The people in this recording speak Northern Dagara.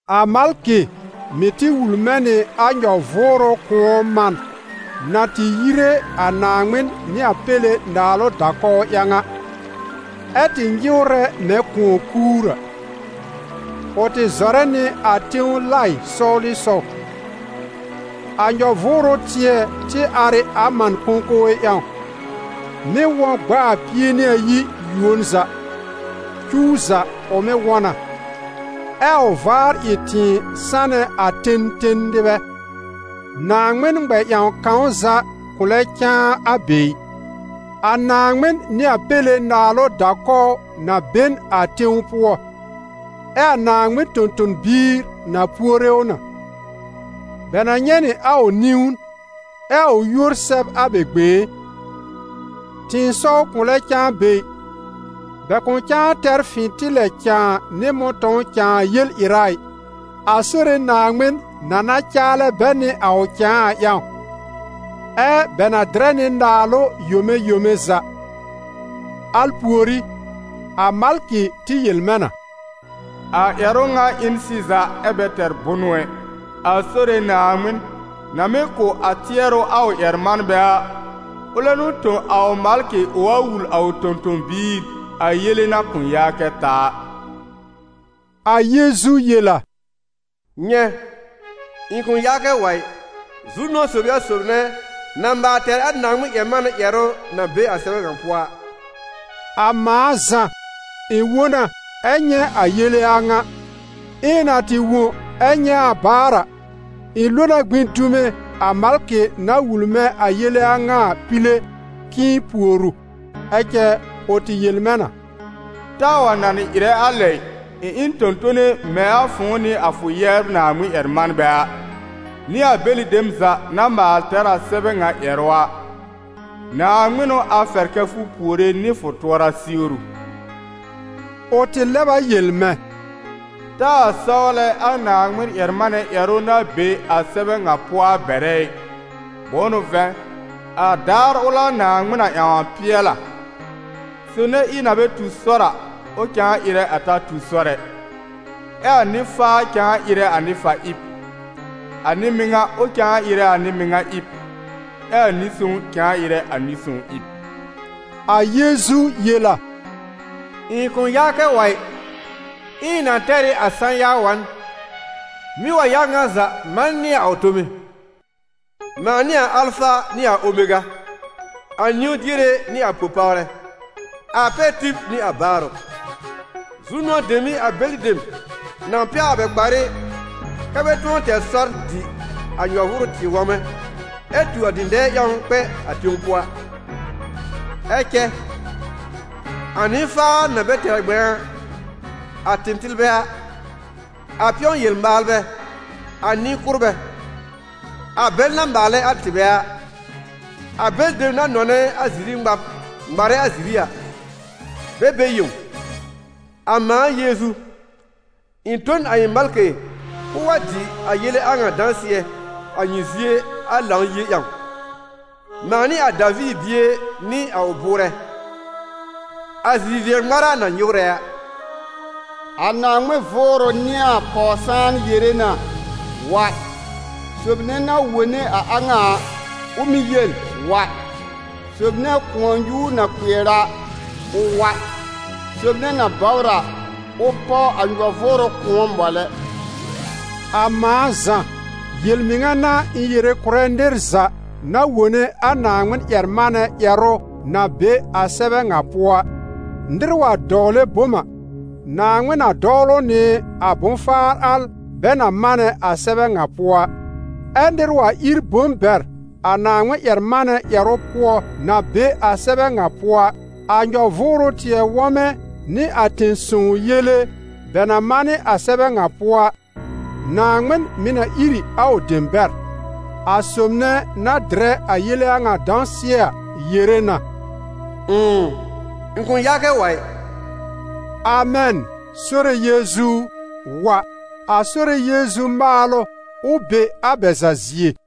A malkɩ mɩ̀ tɩ wul mɛ̃ nɩ a nyɔ-vʋʋrʋ kʋ̃ɔ man na tɩ yire a Naaŋmɩn nɩ a Péle naalʋ da-kɔw ƴãw a, ɛ́ tɩ nyɩwrɛ mɛ̃ kʋ̃ɔ-kuur a; ʋ tɩ zɔrɛ nɩ a tẽw laɩ sɔwlɩsɔw. A nyɔ-vʋʋrʋ tɩɛ tɩ ar ɩ a man kõkowe ƴãw, mɩ́ wɔ̃ gb'a a pie nɩ ayi yuon za, cuw za ʋ mɩ́ wɔ̃ na, ɛ a ʋ vaar ɩ tɩ̃ɩ sanɛ a ten ten nɩbɛ. Naaŋmɩn ŋmɛ-ƴãw kãw za kʋ̃ lɛ cãa a be ɩ. A Naaŋmɩn nɩ a Péle naalʋ da-kɔw na be n a tẽw pʋɔ, ɛ a Naaŋmɩn tõ-tõ-biir na puore ʋ na. Bɛ na nyɛ̃ nɩ a ʋ niwn, ɛ a ʋ yúor sɛb a bɛ gbẽé. Tɩ̃ɩsɔw kʋ̃ lɛ cãa be ɩ, bɛ kʋ̃ cãa tɛr fɩ̃tɩlɛ cãa nɩ mʋ̃tɔ̃w cãa yel-ɩra ɩ, a Sore Naaŋmɩn na na caalɛ bɛ nɩ a ʋ cãa a ƴãw, ɛ́ bɛ na dɩrɛ nɩ naalʋ yome yome za. Al pùorí, a malkɩ tɩ yel mɛ̃ na: «A ƴɛrʋ a ŋa ɩ n sɩza ɛ bɛ tɛr bʋnʋ ɛ. A Sore Naaŋmɩn, na mɩ́ kʋ̀ a tɩɛrʋ a ʋ ƴɛr-manbɛ a, ʋlɛ n'ʋ tõ a ʋ malkɩ ʋ wa wul a ʋ tõ-tõ-biir a yele na kʋ̃ yaa kɛ ta a.» A Yeezu yel a: «Nyɛ̃, ɩ̃ kʋ̃ yaa kɛ wa ɩ! Zu-nʋ̃ɔ sob ɩ a sob nɛ na maal tɛr a Naaŋmɩn-ƴɛr-manɛ ƴɛrʋ na be a sɛbɛ ŋa pʋɔ a!» A mãa Zã, ɩ̃ wõ na ɛ nyɛ̃ a yele a ŋa. Ɛ ɩ̃ na tɩ wõ ɛ nyɛ̃ a baar a, ɩ̃ lo na gbĩ dume a malkɩ na wul mɛ̃ a yele a ŋa a pile k'ɩ̃ɩ pùor ʋ. Ɛ cɛ, ʋ tɩ yel mɛ̃ na: «Taa wa nanɩ ɩrɛ a lɛ ɩ! Ɩ̃ ɩ n tõ-tone mɛ̃ a fʋ̃ʋ nɩ a fʋ yɛbr Naaŋmɩn-ƴɛr-manbɛ a, nɩ a bɛlɩ dem za na maal tɛr a sɛbɛ ŋa ƴɛrʋ a. Naaŋmɩn n'ʋ a fɛr kɛ́ fʋ puore nɩ fʋ tʋɔra siwru!» Ʋ tɩ lɛb a yel mɛ̃: «Taa sɔwlɛ a Naaŋmɩn-ƴɛr-manɛ ƴɛrʋ na be a sɛbɛ ŋa pʋɔ a bɛrɛ ɩ, bʋ̃ʋ n'ʋ vɛ̃, a daar ʋl a Naaŋmɩn na ƴãw a pɩɛl a. Sob nɛ ɩb na bɛ tu sɔr a, ʋ cãa ɩrɛ a ta tu a sɔr ɛ, ɛ a nɩ-faa cãa ɩrɛ a nɩ-fa-ɩb; a nɩ-mɩŋa, ʋ cãa ɩrɛ a nɩ-mɩŋa ɩb, ɛ a nɩ-sõw cãa ɩrɛ a nɩ-sõw ɩb.» A Yeezu yel a: «Ɩ̃ kʋ̃ yaa kɛ wa ɩ! Ɛ ɩ̃ na tɛr ɩ a sã-ya wa n, mɩ́ wa ya ŋa za manɩ nɩ a ʋ tome. Mãa n'ɩ a Alfa nɩ a Omega, a niwn-diere nɩ a po-pawrɛ, a pɛr-tib nɩ a baarʋ.» Zu-nʋ̃ɔ dem n'ɩ a bɛlɩ dem na pɛwr a bɛ kparɩ, kɛ́ bɛ tʋ̃ɔ tɛr sɔr dɩ a nyɔ-vʋʋrʋ tɩɛ wɔmɛ, ɛ tu a dɩ̃dɛɛ ƴãw kpɛ a tẽw pʋɔ a. Ɛ cɛ, a nɩ-faar na bɛ tɛr ŋmɛ̃a a, a tɩtɩlbɛ a, a pɩ̃ɔ-yel-maalbɛ, a nɩ-kʋ́rbɛ, a bɛl na maalɛ a tɩbɛ a, a bɛlɩ dem na nɔnɛ a ziri ŋmab ŋmarɛ a ziri a, bɛ be yẽw! « A mãa Yeezu, ɩ̃ tõ n a ɩ̃ malkɩ k'ʋʋ wa dɩ a yele a ŋa dãsɩɛ a nyɩ zie a Lãw-yie ƴãw. Mãa n'ɩ a Daviir bie nɩ a ʋ bʋʋrɛ, a zi-vɩɛ-ŋmára na nyɩwrɛ a.» A Naaŋmɩn Vʋʋrʋ nɩ a Pɔw-sãan yere na: «Wa!» Sob nɛ na wone a a ŋa a, ʋ mɩ̀ yel: «Wa!» Sob nɛ kʋ̃ɔ-nyuur na kpɩɛr a, ʋ wa; sob nɛ na bɔbr a, ʋ páw a nyɔ-vʋʋrʋ kʋ̃ɔ, mɔlɛ. A mãa Zã, yel-mɩŋa n'a ɩ̃ yere kʋ̀rɛ nɩr za na wone a Naaŋmɩn-ƴɛr-manɛ ƴɛrʋ na be a sɛbɛ ŋa pʋɔ a: nɩr wa dɔwlɛ bom a, Naaŋmɩn na dɔwl ʋ nɩ a bʋ̃-faar al bɛ na manɛ a sɛbɛ ŋa pʋɔ a. Ɛ nɩr wa ír bom bɛr a Naaŋmɩn-ƴɛr-manɛ ƴɛrʋ pʋɔ na be a sɛbɛ ŋa pʋɔ a, a nyɔ-vʋʋrʋ tɩɛ wɔmɛ nɩ a tẽ-sõw yele bɛ na manɩ a sɛbɛ ŋa pʋɔ a, Naaŋmɩn mɩ̀ na ír ɩ a ʋ dem bɛr. A sob nɛ na dɩrɛ a yele a ŋa dãsɩɛ a yere na: «Ʋ̃ʋ, ɩ̃ kʋ̃ yaa kɛ wa ɩ!» Amɛn! Sore Yeezu u, wa! A Sore Yeezu maalʋ, ʋ be a bɛ za zie.